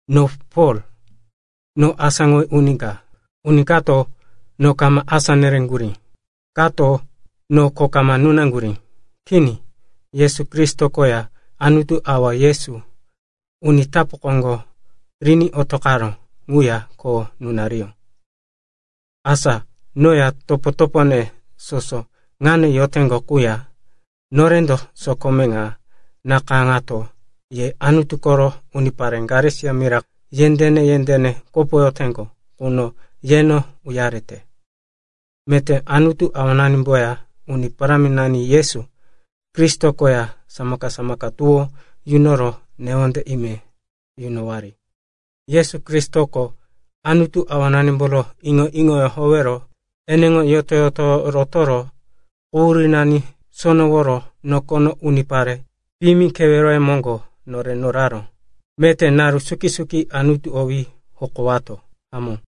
No Pol, noko asáŋowí uni ka. Uni kato no kama asá nereŋgurí, kato no kho kama nunaŋgurí. Kini, Yesu Kristo koya Anutu Awa Yesu uni tapu koŋgo riní otoqaró ŋuya kho nunariyó. Asa noya, topo-topone soso ŋano yoteŋgo quya, norendo sokome ŋa nakayáŋato ye Anutu koro unipare Galesia mira yendéne-yendéne kopoyoteŋgo ŋuno yeno uyarete. Meté Anutu Awananimboya Uni Paráminani Yesu Kristo koya samaka-samaka tuwó yunoro newonde ime yunowari. Yesu Kristoko Anutu Awananimboro iŋo-iŋoyó howero eneŋo yoto-yotoyó rotoro quhurínani soworo nokono unipare piyimi keweroye moŋgo nore noraró. Meté naru suki-suki Anutu owí hokowato. Hamó.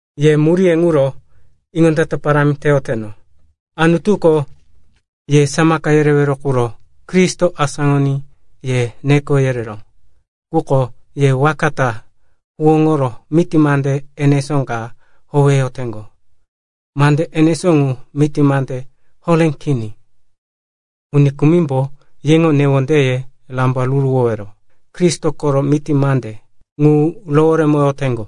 Yeŋo muríye ŋuro iŋondata parámi teyoteno. Anutuko ye samaka yerewero quro Kristo asáŋoní ye neko yereró. Quko ye waka ta huwóŋoro miti mande enesó ka howeyoteŋgo. Mande enesó ŋu miti mande horé kini. Uni kumimbo yeŋo newondeye rambaruruwowero Kristo koro miti mande ŋu roworemoyoteŋgo.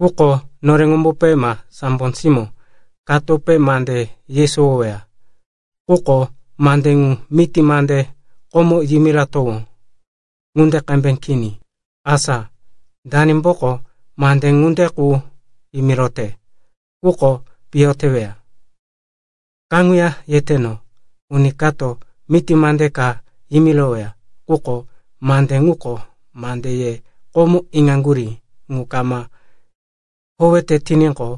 Quko noreŋombope ma sambo simó katope mande yesowoweya, quko mande ŋu miti mande komo yimiratowó ŋunde qembe kini, asa danimboko mande ŋunde qu yimirote, ŋuko piyo teweya. Kaŋuya yeteno, uni kato miti mande ka yimiroweya, quko mande ŋuko mande ye komo iŋaŋgurí ŋu kama howete tiníqo,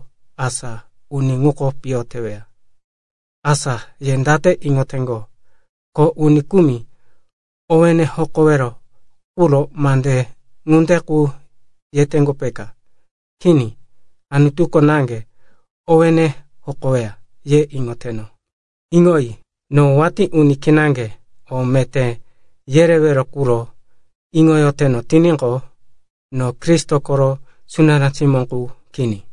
asa uni ŋuko piyo teweya. Asa ye date iŋoteŋgo, ko uni kumi owéne hokowero quro mande ŋunde qu yeteno, peka? Kini, Anutuko naŋge owéne hokoweya, ye iŋoteno. Iŋoyi, no watí uni kinaŋge o meté yerewero ŋuro iŋoyoteno tiníqo, no Kristo koro sunará simó qu kini.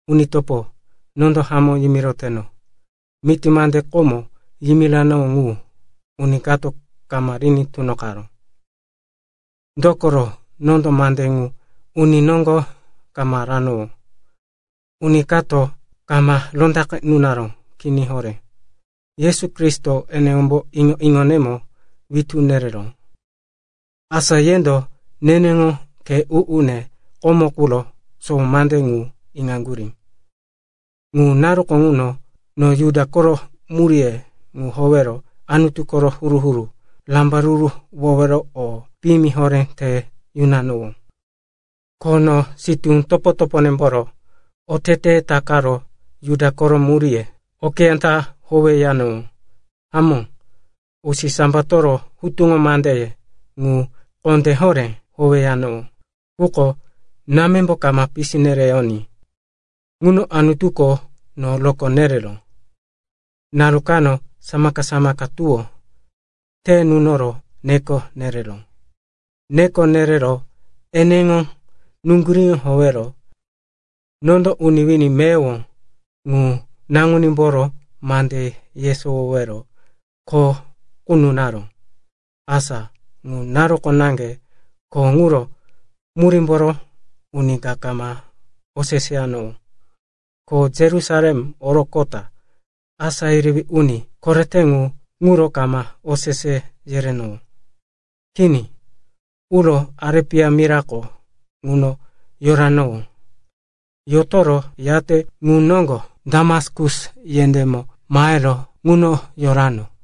Uni topo, nondo hamó yimiroteno, miti mande komo yimiranowó ŋu, uni kato kama riní tunoqaró. Dokoro nondo mande ŋu uni noŋgo kama ranowó. Ko uni kato kama rondaqe nunaró. Kini horé. Yesu Kristo eneŋombo iŋo-iŋonemo witú nereró. Asa yendo neneŋo khe u-une komo quro sowo mande ŋu iŋaŋgurí. Ŋu naruko ŋuno no Juda koro muríye ŋu howero Anutu koro huru-huru rambaruruwowero o piyimi horé te yunanowó. Ko no sitú topo-toponemboro oteteye takaro Juda koro muríye okeyá ta howeyanowó. Hamó, usisambatoro hutuŋo mandeye ŋu kondé horé howeyanowó. Quko námembo kama pisi nereyoní ŋuno Anutuko no rokó nereró. Naru kano samaka-samaka tuwó te nunoro neko nereró. Neko nerero eneŋo nuŋguríŋo howero nondo uni wini meyowo ŋu Naŋunímboro mande yesowowero kho qu nunaró. Asa ŋu naruko naŋge kho ŋuro murímboro uni ka kama oseseyanowó, ko Yerusalem oroqota asá yerewí uni korete ŋu ŋuro kama osese yerenowó. Kini, uro Arepia mirako ŋuno yoranowó. Yotoro, yate ŋu noŋgo Damaskus yendémo mahero ŋuno yorano.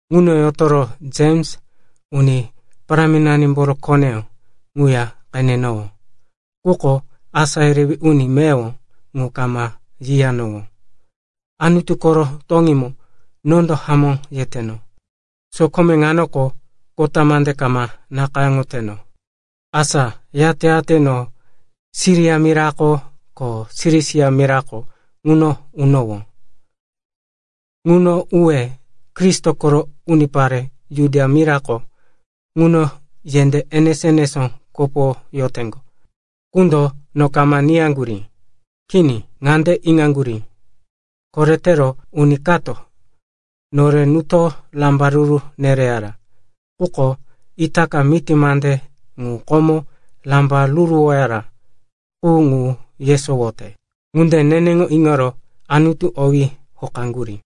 Ŋuno yotoro Jems, Uni Parámimboro koneyó, ŋuya qenenowó, quko asá yerewí uni meyowo ŋu kama yiyanowó. Anutu koro toŋímo nondo hamó yeteno, sokome ŋanoko kota mande kama nakayáŋoteno. Asa yate-yate no Siria mira ko Silisia mirako ŋuno unowó. Ŋuno uwe Kristo koro unipare Judia mirako ŋuno yendé enemo-enemo kopoyoteŋgo, ŋundo no kama niyaŋgurí. Kini, ŋande iŋaŋgurí, “Koretero uni kato nore nuto rambaruru nereyara. Quko itaka miti mande ŋu komo rambaruruwoyara qu ŋu yesowoyote.” Ŋunde neneŋo iŋoro Anutu owí hokaŋgurí.